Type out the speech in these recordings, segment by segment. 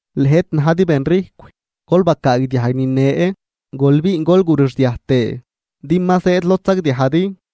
¡Lëjt, najdi benrijcw! Gol bacaagdiajg nine, gol biin gol gurixdiaj tëë, din ma zëëd lod sagdiajdi,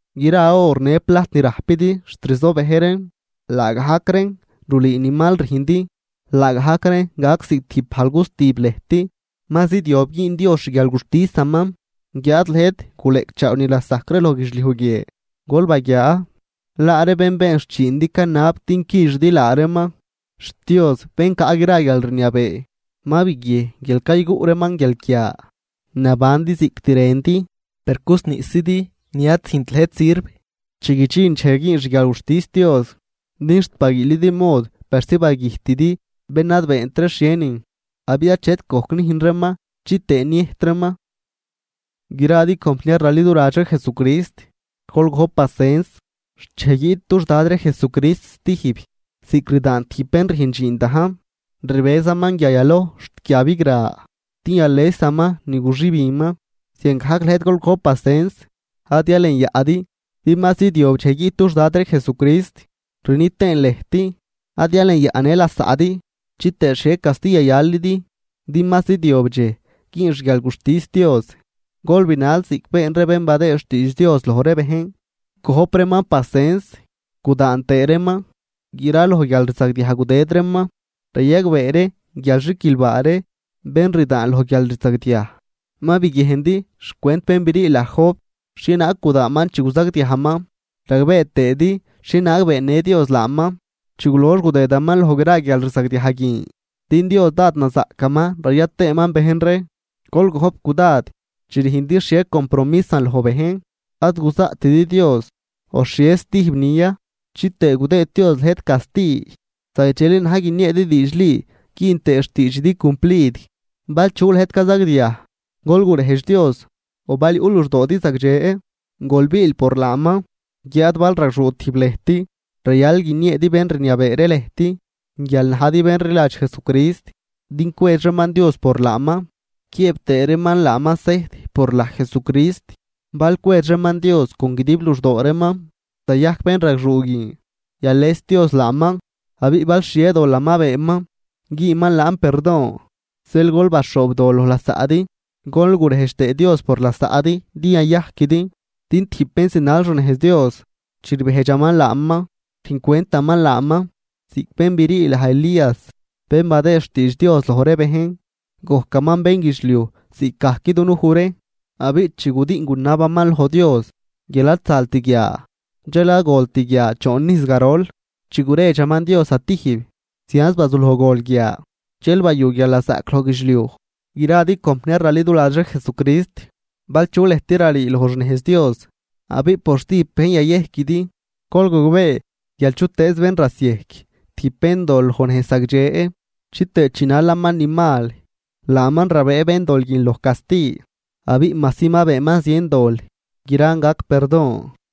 Gra or në plajt ni rajpidi xt rzobëj reen, laagajc reen rulüü ni mal rüjndi, laagajc reen gac ziꞌc tijb bajl gustib lëjt. Ma zidyob güün Dios xguialguxtisaman, guiáad lëjt guleꞌcchaaw ni lasajc ree loj guidxliuj guie. Gol baguiaa, laa ree bén been xchiindi canab din quixidi laa reeman, xt Dios bén caꞌ gra guialrniabee ma biguiejn guial cayguꞌ reeman guialquia. Nabandi ziꞌct rëndi, per cusniꞌszidi ni ad züjnt lëjt sirv chi guidxin dxej güün xguialguxtis Dios. Din xt baguiilidi mod persi bagüjtidi bén ad beent ree xhienin, abiꞌ achet gojc nüjn reeman chitëë niëjt reeman. Gradi compniar raliduladx ree Jesucrist, gol gojp pasens xt dxej guiꞌt dux Dad ree Jesucrist stijb, ziꞌc rdaan tijb bén rüjn dxiin dajn, rbëzaman guia yaloj xt guia bigra din yalesaman ni guxübinman. Ziangajc lëjt gol gojp pasens, ad yalenyaꞌdi, din ma zidyob dxej guiꞌt dux Dad ree Jesucrist. Rni tëën lëjt, ad yalenyaꞌ në lasaꞌdi, chitëë xhie casti yayalidi, din ma zidyob dxej güün xguialguxtis Dios. Gol binal ziꞌc been ree bén badëë xtiidx Dios loj ree bejn, gojp reeman pasens gudaan tëë reeman graloj guialrzagdiaj gudëd reeman. Rayagbee ree guial xiquilbaa ree bén rdaan loj guialrzagdiaj. Ma biguiejndi xcwent bén brii laj Job, xhienaag gudaanman chi guzagdiajman, ragbee tëëdi xhienaag beennë Dios laaman, chi gulox gudëdaman loj gra guialrzagdiaj guin, din Dios dád nazaꞌcaman raya tëëman bejn ree. Gol gojp cudad chi rüjndi xhie compromisan loj bejn, ad guzaꞌtidi Dios o xhie stijbnin ya, chitëë gudëëd Dios lëjt casti, zagdxeli na̱j guinieedi diidxli güün tëë xtiidxidi cumplid. Bal chu lëjt cazagdiaj, gol gurejdx Dios, o bal yuꞌ luxdoodi zagdxe, gol biil par laaman. Guiáad bal ragxuu tijb lëjt, rayal guinieedi bén rniabee ree lëjt guial najdi bén rliladx Jesucrist, din cwedx reeman Dios por laaman quiëëb tëë reeman laaman sejt por laj Jesucrist. Bal cwedx reeman Dios con guidib luxdoo reeman, zayajc bénragxuu guin, yales Dios laaman, abiꞌ bal xhie dolan ma beenman, güünman laan perdon. Zeel gol baxhoobdol loj lasaꞌdi gol gurejdx tëë Dios por lasaꞌdi din yayajquidi, din tijb bén zinal xnejz Dios, chi rbejdxaman laaman, rüjn cwentaman laaman. Ziꞌc bén brii laj Elías bén badëë xtiidx Dios loj ree bejn, gojcaman bénguidxliuj ziꞌcgajc dunuj ree, abiꞌ chi gudiꞌn gunabaman loj Dios guial ad zalt guia, dxel ad golt guia choon ijz garol. Chi guredxaman Dios zatijb, zianz bazuloj gol guia, dxel bayu guialnazaꞌc loj guidxliuj. Gradi compniar raliduladx ree Jesucrist, bal chu lëjt rarii loj xnejz Dios abiꞌ por stijb bejn yayejquidi, gol gogbee guial chutëëz bén rasiejc tijb béndol loj nejz zagdxe chitëë chinalaman ni mal, laaman rabëë béndol guin loj casti, abiꞌ majsi ma beenman zien dol, gran gac perdon.